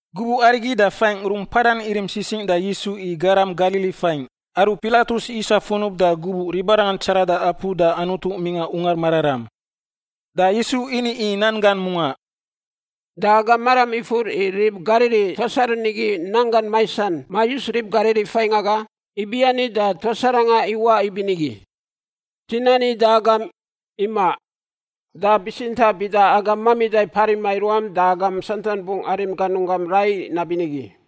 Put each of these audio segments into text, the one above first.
Gubuꞌ arigi da faingꞌ rungꞌ mpadan irim sisingꞌ da Yisu i garam Galili faingꞌ aru Pilatus isa funub da gubuꞌ ribarangan tsarada apu da Anutu mingꞌa Ungar Mararam. Da Yisu ini i nan gan mungaꞌ, “Da agam maram ifur i rib Galili tuas aru nigi nanggan maisan mayus rib Galili faingꞌ aga, ibiani da tuas aranga iwaꞌ ibinigi? Dzi nani da agam, imaꞌ! Da bitsintaꞌ bida agam mamida parima i ruam da agam santan bungꞌ arim ganunggam rai nabinigi.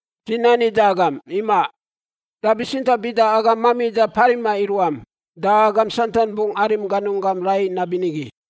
Dzi nani da agam, imaꞌ! Da bitsintaꞌ bida agam mamida parima i ruam da agam santan bungꞌ arim ganunggam rai nabinigi.”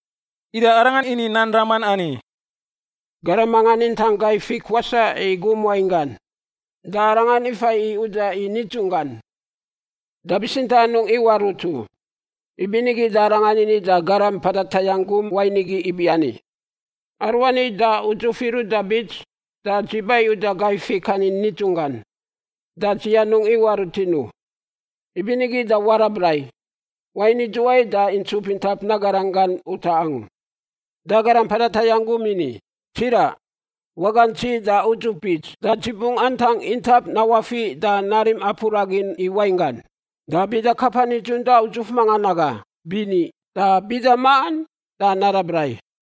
Ida Arangan ini nan raman ani: “Garam mangan intang gai fik wasaꞌ i gum wain gan, da arangan ifa i uda i nidzunggan, da bitsintaꞌ anungꞌ iwaꞌ rut u. Ibinigi da arangan ini da garam mpada tayangꞌ gum wain igi ibiani, ‘Aruani da udzuf iruꞌ da bits da dzi ba i uda gai fik ani nidzunggan da dzi anungꞌ iwaꞌ rutin u. Ibinigi da warab rai! Wain idzuwai da intsup intap nagaran gan utaꞌ angu?’ Da garam mpada tayangꞌ gum ini, ‘Tsiraꞌ, wagantsi da udzuf bits, da dzi bungꞌ antang intap nawafiꞌ da narim apu ragin i wainggan. Da bida kapa nidzun da udzuf mangan aga, bini! Da bida maꞌan, da narab rai.’”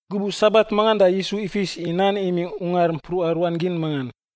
Gubuꞌ Sabat mangan da Yisu ifis i nan imingꞌ ungar mpruꞌa ruan gin mangan.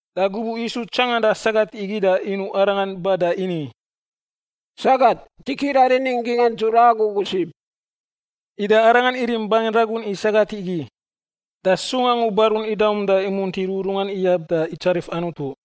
Da gubuꞌ Yisu tsanganda sagat igi da inuꞌ arangan ba da ini, “Sagat, dzi kiraꞌ rinin gingꞌan dzura agu ugu sib.” Ida Arangan irim bangin ragun i sagat igi, da sung angu barun idaum da imunti rururungan iyab da itsarif Anutu.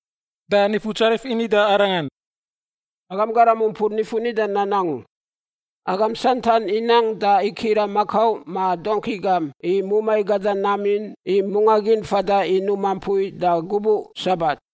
Da Nifutsarif ini da arangan, “Agam garam umpur nifun nida nan angu! Agam santan inang da ikiraꞌ makau ma dongki gam i mumai gada nam in i mungꞌa gin fada i numa mpui da gubuꞌ Sabat!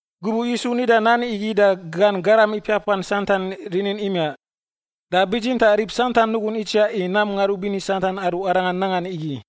Gubuꞌ Yisu nida nan igi da gan garam ipiapan santan rinin imiaꞌ, da bitsintaꞌ rib santan nugun itsiaꞌ i nam ngarubini santan aru Arangan nangan igi.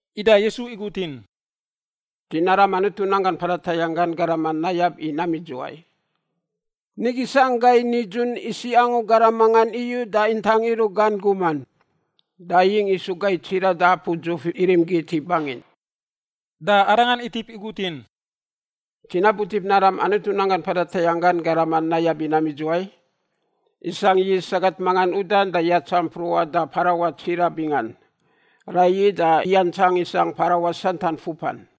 Ida Yisu igutin, “Dzi naram Anutu nanggan mpada tayangꞌ gan garaman nayab i nam idzuwai? Nigi sangꞌ gai nidzun isiꞌ angu garam mangan udan da ntanga ruꞌa gan guman. Da iyingꞌ isu gai tsiraꞌ da apu dzuf irim git i bangin.” Da Arangan itip igutin, “Dzi nabutip naram Anutu nanggan mpada tayangꞌ gan garaman nayab i nam idzuwai? Isangꞌ yist sagat mangan udan da yatsa mpruꞌan da parawaꞌ tsiraꞌ bingan. Raiyi da iyantsang isangꞌ parawaꞌ santan fupan.”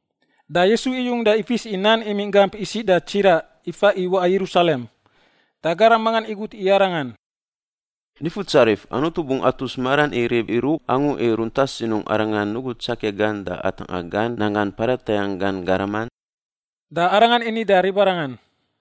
Da Yisu iyung da ifis i nan imingꞌ gamp isiꞌ da tsiraꞌ ifa i waꞌa Yerusalem. Da garam mangan igut i Arangan, “Nifutsarif, Anutu bungꞌ atus maran i rib iruꞌ angu i runta sinungꞌ Arangan nugu tsakia gan da atangꞌa gan nanggan mpada tayangꞌ gan garaman?” Da Arangan ini da ribarangan,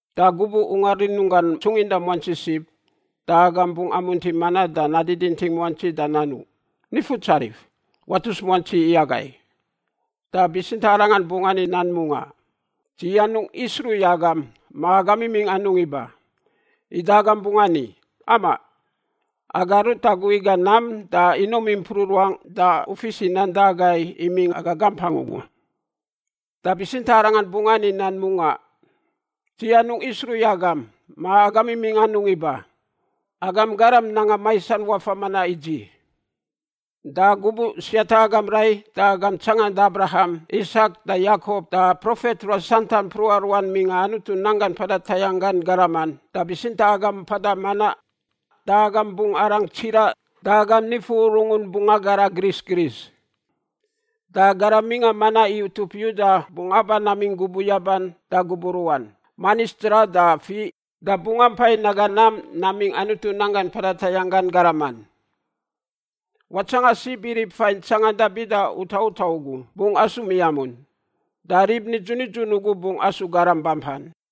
Da gubuꞌ ungar rinunggan tsunginda muantsi sib, da agam bungꞌ amunti manaꞌ da nadiditing muantsi da nanuꞌ, ‘Nifutsarif, watus muantsi i agai.’ “Da bitsintaꞌ Arangan bungꞌ ani nan mungaꞌ, ‘Dzi anungꞌ isruꞌ i agam ma agam imingꞌ anungꞌ iba.’ “Ida agam bungꞌ ani, ‘Amaꞌ. Aga rut agu iga nam da inum impruꞌ ruangꞌ da u fis i nan da agai imingꞌ aga gampangꞌ ugu.’ “Da bitsintaꞌ Arangan bungꞌ ani nan mungaꞌ, ‘Dzi anungꞌ isruꞌ i agam ma agam imingꞌ anungꞌ iba. Agam garam nanga maisan wafa manaꞌ i dzi!’ Da gubuꞌ siata agam rai da agam tsanganda Abraham, Isak, da Yakop, da profet ruas santan mpruꞌa ruan mingꞌa Anutu nanggan mpada tayangꞌ gan garaman, da bitsintaꞌ agam mpada manaꞌ, da agam bungꞌ arang tsiraꞌ da agam nifu urungun bungꞌ agara gris gris. Da garam mingꞌa manaꞌ i utup Yuda bungꞌ aba namingꞌ gubuꞌ yaban da gubuꞌ ruꞌan, manis dzraꞌ da fiꞌ, da bungꞌ ampai naga nam namingꞌ Anutu nanggan mpada tayangꞌ gan garaman. Watsangan sib i rib fain tsanganda bida utaꞌ utaꞌ ugu bungꞌ asu miamun, da rib nidzun nidzun ugu bungꞌ asu garam bampan.”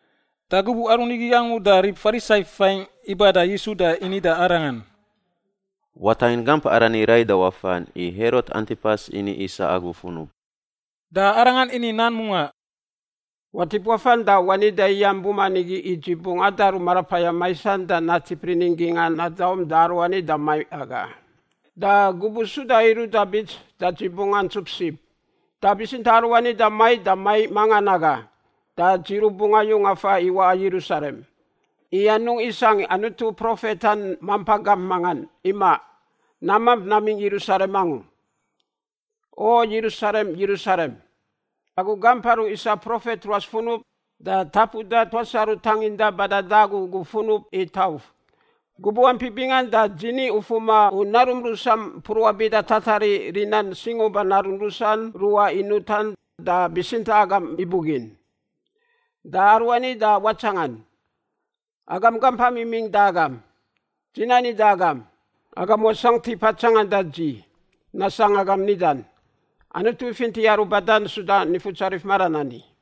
Da gubuꞌ aru nigi angu da rib Farisai faingꞌ iba da Yisu da ini da Arangan, “Watangin gamp arani rai da wafan, i Herot Antipas ini isa agu funub.” Da Arangan ini nan mungaꞌ, “Watip wafan da wani da iyam buman igi i dzi bungꞌ adaru marapayam maisan da natip rinin gingꞌan nadaum da aruani da maiꞌ aga. Da gubuꞌ suda iruꞌ da bits da dzi bungꞌ antsup sib. Da bitsintaꞌ aruani da maiꞌ da maiꞌ mangan aga da dzi rubungꞌ ayung afan i waꞌa Yerusalem, i anungꞌ isangꞌ Anutu profetan mampa gamp mangan; imaꞌ, namamp namingꞌ Yerusalem angu. “O Yerusalem, Yerusalem, agu gamp aru isa profet ruas funub da tapuda tuas aru tanginda bada da agu ugu funub i tauf! Gubuꞌ ampi bingan da dzi ni ufuma u narum rusam mpruꞌa bida tatariꞌ rinan singuba narun rusan ruꞌa inutan da bitsintaꞌ agam ibugin. Da aruani da watsangan, agam gampam imingꞌ da agam. Dzi nani da agam, agam wasangꞌ tipa tsanganda dzi, nasangꞌ agam nidan, ‘Anutu ifinti aru badan suda Nifutsarif maran ani.’”